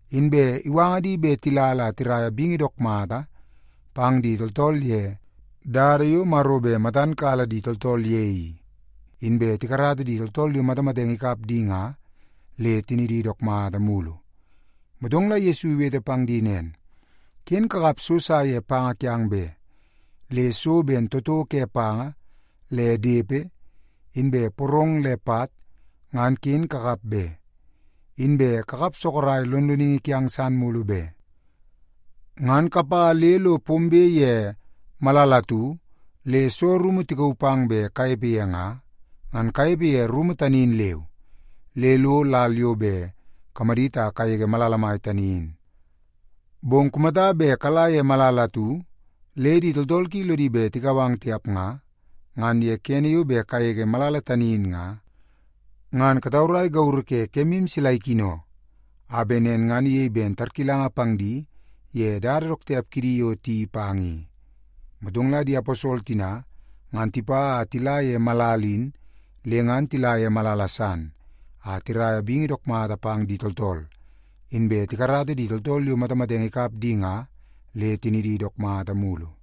Inbe iwanga di bet tila la tiraia bingi dook mata pang di tooltool ye dada yo Maro bet matan kala di tooltool ye i, inbe tikarata di tooltool yo matamatenge ikap di nga le tinidi dook mata mulu. Motong la Yesu iwete pang di nen, “Ken kakap so sa ye panga kiang be. Le so ben toto ke panga le depe, inbe porong le pat, ngan ken kakap be. Inbe kakap sorok lonloningi kiang san mulu be. Ngan kapa le lo pombe ye malala atu le soo rumu tikauu pang bet kanepe ye nga, ngan kanepe ye rumu tani in leu, le lo lal yo bet kamadit a kagege malala mai tani in. Bong kumata bet kala ye malala atu le di tooltool ki lodi bet tikau ang tiap nga, ngan ye kene yo bet kagege malala tani in nga, ngan kataurai gauru ke kemu sila ikino, a bet nen ngan iyei ben tarkilanga pang di ye dada dook tiap kidi yo tiyeii pang i.” Motong la di aposol tina ngan tipa a tila ye malala in le ngan tila ye malala san a tiraia bingi dook mata pang di tooltool, inbe tikarata di tooltool yo matamatenge ikap di nga, le tinidi dook mata mulu.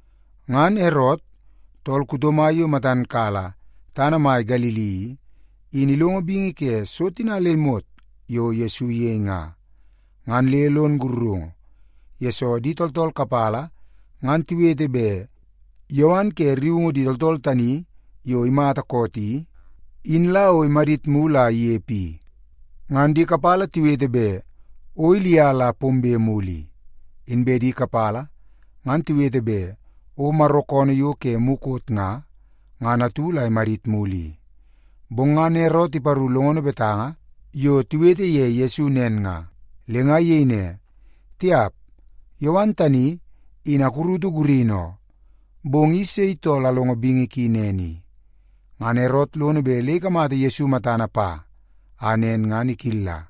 Ngan Erot, tool kuto mai yo matan kala tana mai Galili i, in ilongo bingi ke so tina le imot yo Yesu iyei nga, ngan le lon sakarungu, yesoo di tooltool kapala ngan tiwete bet Yowan ke rriungu di tooltool tani yo imata koot i, in la o imadit mulu a inepe i. Ngan di kapala tiwete bet o Ilia la pombe mulu i, inbe di kapala ngan tiwete bet o Maro koonoo yo ke mukot nga, ngan atu la imadit mulu i. Bong ngan Erot iparu longono betanga yo tiwete ye Yesu nen nga, le nga iyei ne, “Tiap, Yowan tani, in akurutu gurini oo. Bong i sei tool alongo bingi ki nen i?” Ngan Erot lono bet le ikamata Yesu matana pa a nen ngan ikilla.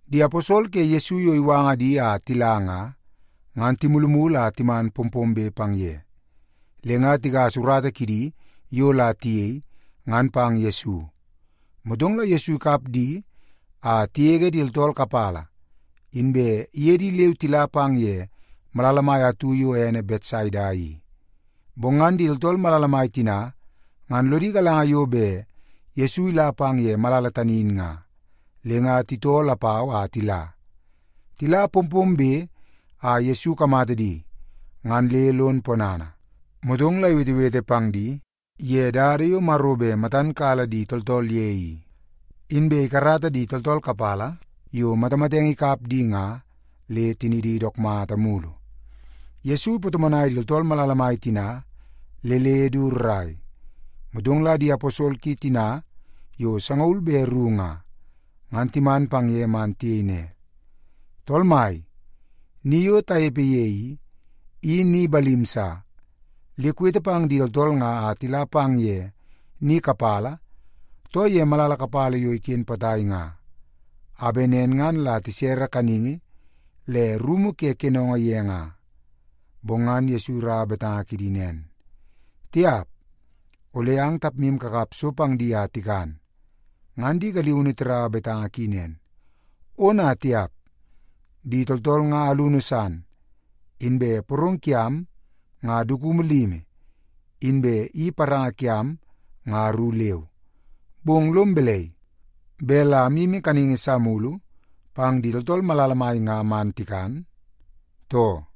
Di aposol ke Yesu yo iwanga di a tila nga, ngan timulumulu a timan pompombe pang ye, le nga tigasa urata kidi yo la tiyei, ngan pang Yesu. Motong la Yesu ikap di a tigege di tooltool kapala, inbe iye di leu tila pang ye malala mai atu yo ene Betsaida i. Bong ngan di tooltool malala mai tina ngan lodi galanga yo bet Yesu ila pang ye malala tani in nga, le nga titoo lapau a tila. Tila pompombe a Yesu ikamata di, ngan le lon ponana, motong la iwetewete pang di ye dada yo Maro bet matan kala di tooltool ye i, inbe ikarata di tooltool kapala yo matamatenge ikap di nga, le tinidi dook mata mulu. Yesu ipatomonai di tooltool malala mai tina le le du rrai. Motong la di aposol ki tina yo sangaul be ru nga, ngan timan pang ye man tiyei ne, “Tool Mai, ni yo tanepe ye i, i ni balim sa. Le kuwete pang di tooltool nga a tila pang ye ni kapala, too ye malala kapala yo iken potai nga, a bet nen ngan la tisere kaningi le rumu ke kenongo ye nga.” Bong ngan Yesu iraua betanga kidi nen, “Tiap! Ole ang tapmu kakap so pang di a tikan.” Ngan di galiunu tiraua betanga ki nen, “Ona tiap! Di tooltool nga alunu san. Inbe porong kiam nga dukumu limi, inbe i paranga kiam nga ru leu. Bong lom balai, bet la amyimi kaningi sa mulu pang di tooltool malala mai nga man tikan, too?”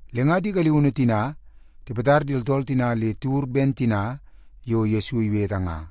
Le nga di galiunu tina tipatar di tooltool tina le tiwur ben tina yo Yesu iwete nga.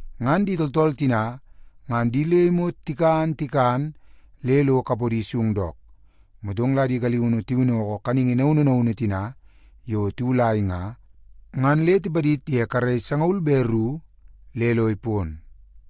Ngan di tooltool tina ngan di le imot tikan tikan le lo kapodi sung dook. Motong la di galiunu tiwinnoko kaningi naunu naunu tina yo tiwulai nga, ngan le tipadid ye karei sangaul be ru le lo ipon.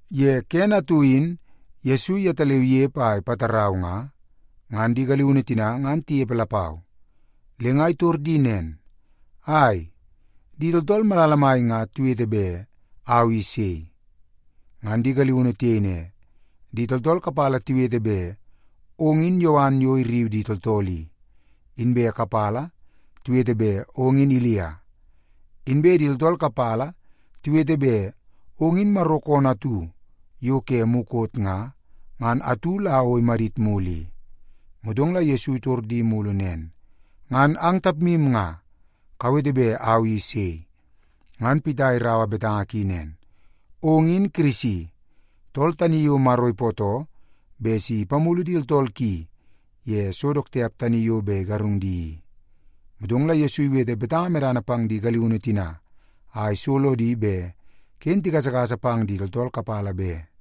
Ye kene atu in Yesu yetaleu inepe a ipatarau nga, ngan di galiunu tina ngan tinepe lapau. Le nga itor di nen, “Ai, di tooltool malala mai nga tiwete bet au i sei?” Ngan di galiunu tiyei ne, “Di tooltool kapala tiwete bet ong in Yowan yo irriu di tooltool i, inbe kapala tiwete bet ong in Ilia. Inbe di tooltool kapala tiwete bet ong in Maro koonoo atu yo ke mukot nga, ngan atu la o imadit mulu i.” Motong la Yesu itor di mulu nen, “Ngan ang tapmu nga, kawete bet au i sei?” Ngan Pita iraua betanga ki nen, “Ong in Kirisi, tool tani yo Maro ipootoo bet si ipamulu di tooltool ki ye so dook tiap tani yo bet igarung di i.” Motong la Yesu iwete betanga medana pang di galiunu tina a iso lodi bet ken tigasagasa pang di tooltool kapala be.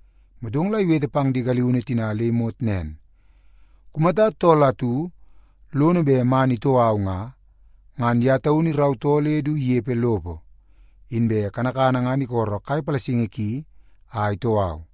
Motong la iwete pang di galiunu tina le imot nen, “Kumata tool atu lono bet man itoo au nga, ngan ye taunu irautoo le du inepe lopo, inbe kanakana ngan isolo kai palasingi ki a itoo au.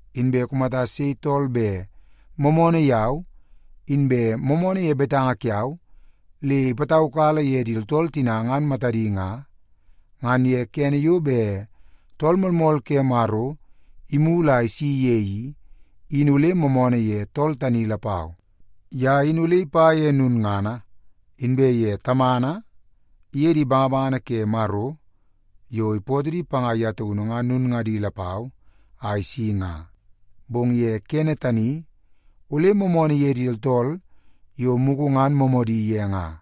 Inbe kumata sei tool bet moomoonoo yau, inbe moomoonoo ye betanga kiau le ipataukala ye di tooltool tina ngan matadi nga, ngan ye kene yo bet Tool Moolmool ke Maro imulu a isi ye i, in ole moomoonoo ye tool tani lapau. Ye in ole ipa ye lulngana, inbe ye Tamana iye di bangabangana ke Maro yo ipootoo di panga ye taunu ngan lulngadi lapau a isi nga, bong ye kene tani ole moomoonoo ye di tooltool yo mugu ngan moomoodi ye nga.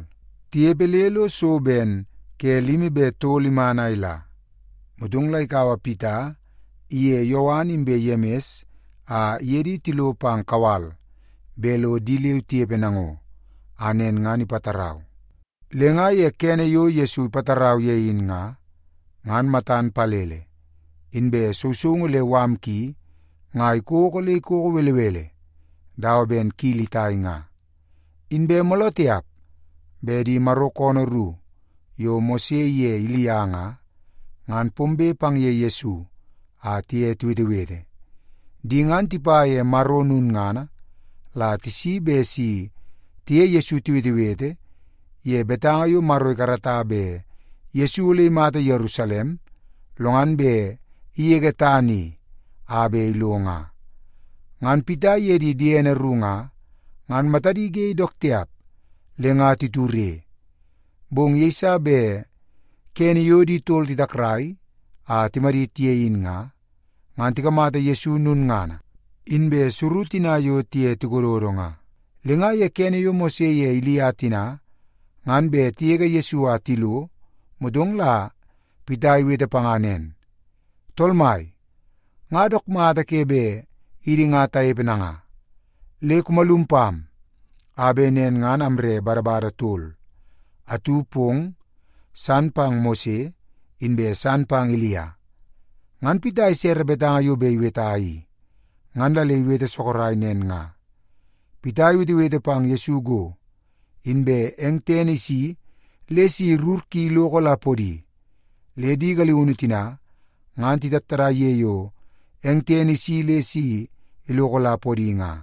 Tinepe le lo so ben ke limi be tol iman a ila, motong la ikaua Pita iye Yowan inbe Yemis a iye di tilo pang kawal bet lo di leu tinepe nango, a nen ngan ipatarau. Le nga ye kene yo Yesu ipatarau ye in nga, ngan matan palele, inbe sousoungu le mala ki nga ikoko le ikoko belebele dawa ben kili itai nga. Inbe mooloo tiap bet di Maro koonoo ru yo Mose iye Ilia nga, ngan pombe pang ye Yesu a tiye tiwetewete. Di ngan tipa ye Maro lulngana la tisi bet si tiye Yesu tiwetewete ye betanga yo Maro ikarata bet Yesu ole imata Yerusalem, lo ngan bet igege tana i a bet ilo nga. Ngan Pita iye di diene ru nga, ngan matadi ge dook tiap le nga titure. Bong yeiso bet kene yo di tol titakrai a timadit ye in nga, ngan tikamata Yesu lulngana, inbe suru tina yo tiye tikododo nga. Le nga ye kene yo Mose ye Ilia tina ngan bet tigege Yesu a tilo, motong la Pita iwete panga nen, “Tool Mai, nga dook mata ke bet idi nga tanepe nanga. Le kumalum pam, a bet nen ngan amre badabada tol; atu pong, san pang Mose, inbe san pang Ilia.” (Ngan Pita isere betanga yo bet iweta i, ngan la le iwete sorok nen nga.) Pita iwetewete pang Yesu go, inbe eng tene isi le si rur ki iloko la podi, le di galiunu tina ngan titattadai ye yo eng tene isi le si iloko la podi nga.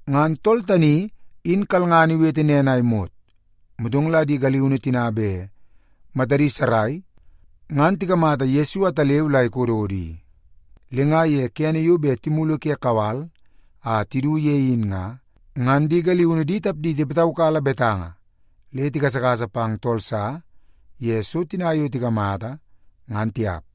Ngan tool tani in kalngana iwete nen a imot, motong la di galiunu tina bet matadi sarai ngan tikamata Yesu ataleu la ikododo i. Le nga ye kene yo bet timulu ke kawal a tidu ye in nga, ngan di galiunu di tapdi tipataukala betanga le tigasagasa pang tool sa ye so tina yo tikamata, ngan tiap.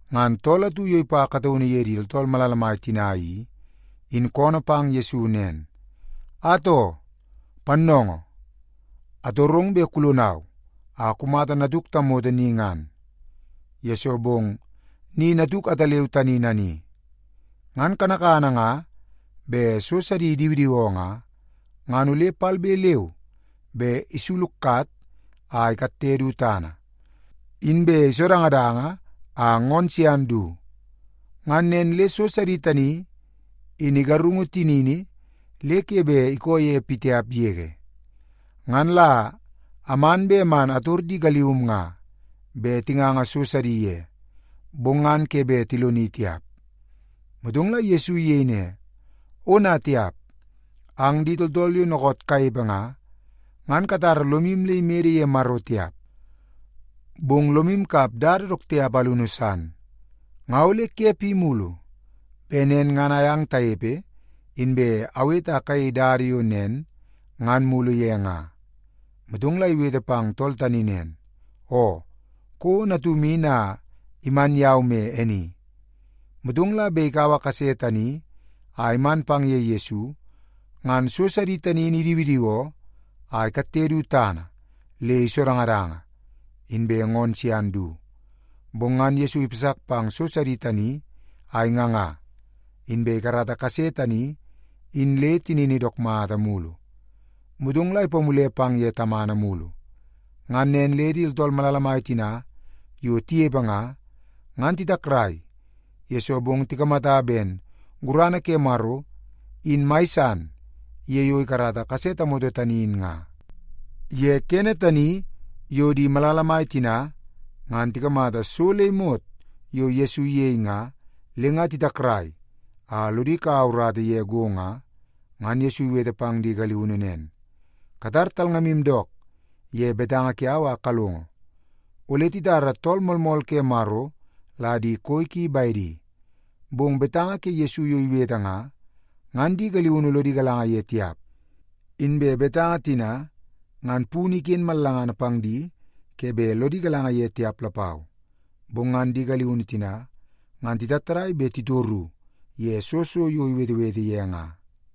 Ngan tool atu yo ipa kataunu ye di tooltool malala mai tina i, in koonoo pang Yesu nen, “Atoo, Pannoongoo, atorong bet kulonau a kumata natuk tamoto ni ngan, yesoo bong ni natuk ataleu tani nani. Ngan kanakana nga bet so sidi idiwidiwoo nga, ngan ole palbe leu be isulukat a ikatte du tana, inbe isodangadanga a ngoonoo sian du. Ngan nen le so sidi tani in igarungu tinini le ke bet ikoo ye pitiap yege. Ngan la aman bet man ator di galium nga bet tinganga so sidi ye, bong ngan ke bet tiloni tiap.” Motong la Yesu iyei ne, “Ona tiap! Ang di tooltool yo dookoot kanepe nga, ngan katara lomu le imede ye Maro tiap, bong lomu kap dada dook tiap alunu san. Nga ole ke pi mulu bet nen ngan ayang tanepe inbe awete a kayei dada yo nen ngan mulu ye nga?” Motong la iwete pang tool tani nen, “Oo, kouo natum in a iman yau me e ni.” Motong la bet ikaua kase tani a iman pang ye Yesu, ngan so sidi tani in idiwidiwoo a ikatte du tana le isodangadanga, inbe ngoonoo sian du. Bong ngan Yesu ipasak pang so sidi tani a inganga, inbe ikarata kase tani in le tinini dook mata mulu. Motong la ipamule pang ye tamana mulu. Ngan nen le di tooltool malala mai tina yo tinepe nga, ngan titakrai, yesoo bong tikamata ben gurana ke Maro in mai san ye yo ikarata kase tamoto tani in nga. Ye kene tani yo di malala mai tina ngan tikamata so le imot yo Yesu iyei nga le nga titakrai a lodi kaua urata ye go nga, ngan Yesu iwete pang di galiunu nen, “Katar talngamu dook ye betanga kiau a kalongo. Ole titara Tool Moolmool ke Maro la di koi ki bedi.” Bong betanga ke Yesu yo iwete nga, ngan di galiunu lodi galanga ye tiap. Inbe betanga tina ngan punu iken mallangana pang di ke bet lodi galanga ye tiap lapau. Bong ngan di galiunu tina ngan titattadai bet titoru ye soo so yo iwetewete ye nga.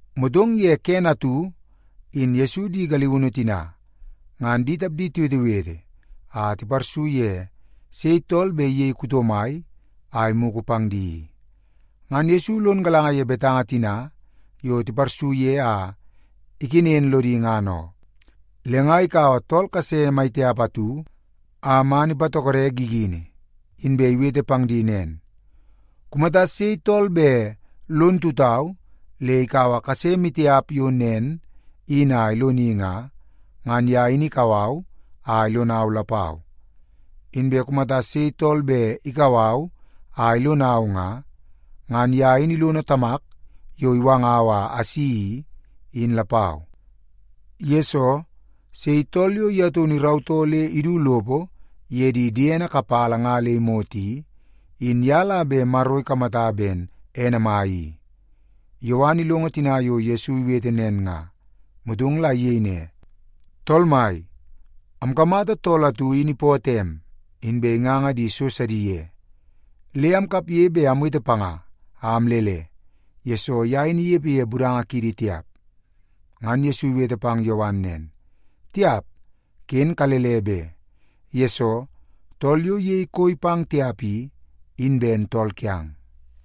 Motong ye kene atu in Yesu di galiunu tina ngan di tapdi tiwetewete a tiparsu ye sei tool bet iyei kuto mai a imugu pang di i. Ngan Yesu lon galanga ye betanga tina yo tiparsu ye a ikenen lodi ngan oo. Le nga ikaua tool kase mai tiap atu a iman ipatokode gigini. Inbe iwete pang di nen, “Kumata sei tool bet lon tutau le ikaua kase maitiap yo nen in a iloni nga, ngan ye in ikau au a ilonau lapau. Inbe kumata sei tool bet ikau au a ilonau nga, ngan ye in ilono Tamak yo iwangau a asi i, in lapau. Yesoo, sei tool yo ye taunu irautoo le idu lopo ye di diene kapala nga le imot i, in ye la bet Maro ikamata ben ene mai i.” Yowan ilongo tina yo Yesu iwete nen nga, motong la iyei ne, “Tool mai, amkamata tool atu in ipootoo em, inbe inganga di so sidi ye. Le amkapge bet amwete panga a amlele, yesoo ye in inepe ye budanga kiidi tiap.” Ngan Yesu iwete pang Yowan nen, “Tiap, ken kalele be! Yesoo, tool yo iyei koi pang tiap i, in ben tool kiang.”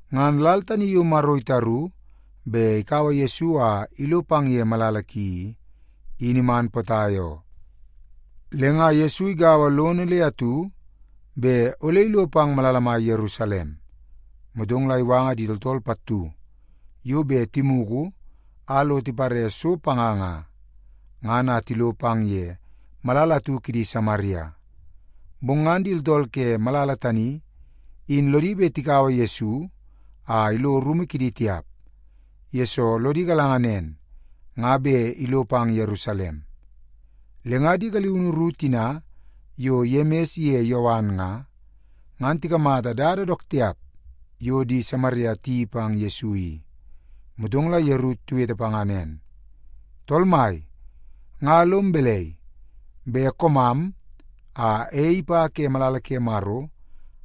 Ngan lal tani yo Maro itaru bet ikaua Yesu a ilo pang ye malala ki i, in iman potai oo. Le nga Yesu igaua lono le atu bet ole ilo pang malala mai Yerusalem. Motong la iwanga di tooltool pattu yo bet timugu a lo tipare so panga nga, ngan a tilo pang ye malala atu kidi Samaria. Bong ngan di tooltool ke malala tani in lodi bet tikaua Yesu a ilo rumu kidi tiap, yesoo lodi galanga nen nga bet ilo pang Yerusalem. Le nga di galiunu ru tina yo Yemis ye Yowan nga, ngan tikamata dada dook tiap yo di Samaria tiyeii pang Yesu i, motong la yeru tiwete panga nen, “Tool mai, nga lom balai, bet koomam a ei ipa ke malala ke Maro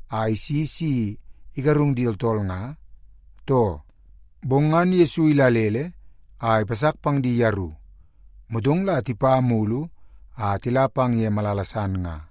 a isi si igarung di tooltool nga, too?” Bong ngan Yesu idalele a ipasak pang di yeru. Motong la tipa mulu a tila pang ye malala san nga.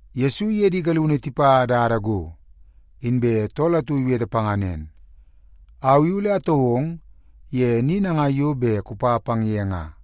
Yesu iye di galiunu tipa dada go, inbe tool atu iwete panga nen, “Au i ole atoo ong ye ni nangai yo bet kupa pang ye nga.”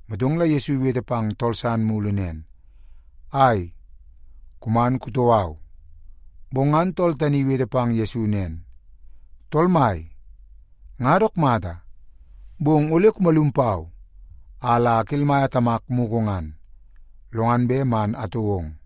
Motong la Yesu iwete pang tool san mulu nen, “Ai, kuman kutoo au.” Bong ngan tool tani iwete pang Yesu nen, “Tool Mai, nga dook mata, bong ole kumalum pau a la akelmaia tamak mugu ngan, lo ngan bet man atoo ong.”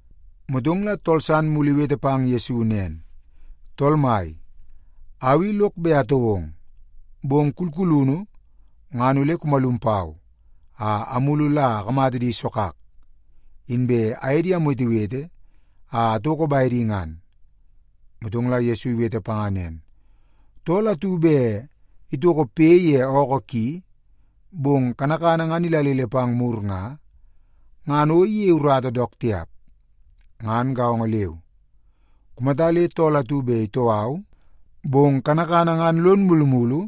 Motong la tool san mulu iwete pang Yesu nen, “Tool Mai, au i lok bet atoo ong. Bong kulkulunu ngan ole kumalum pau a amulu la akamata di sogak, inbe aye di amwetewete a atoko bedi ngan.” Motong la Yesu iwete panga nen, “Tool atu bet itoko poi ye ookoo ki, bong kanakana ngan idalele pang mur nga, ngan o iyei urata dook tiap. Ngan gaongo leu, kumata le tool atu bet itoo au, bong kanakana ngan lono mulumulu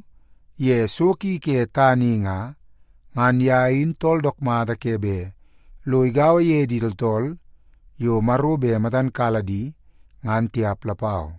ye so ki ke tana i nga, ngan ye in tool dook mata ke bet lo igaua ye di tooltool yo Maro bet matan kala di, ngan tiap lapau.”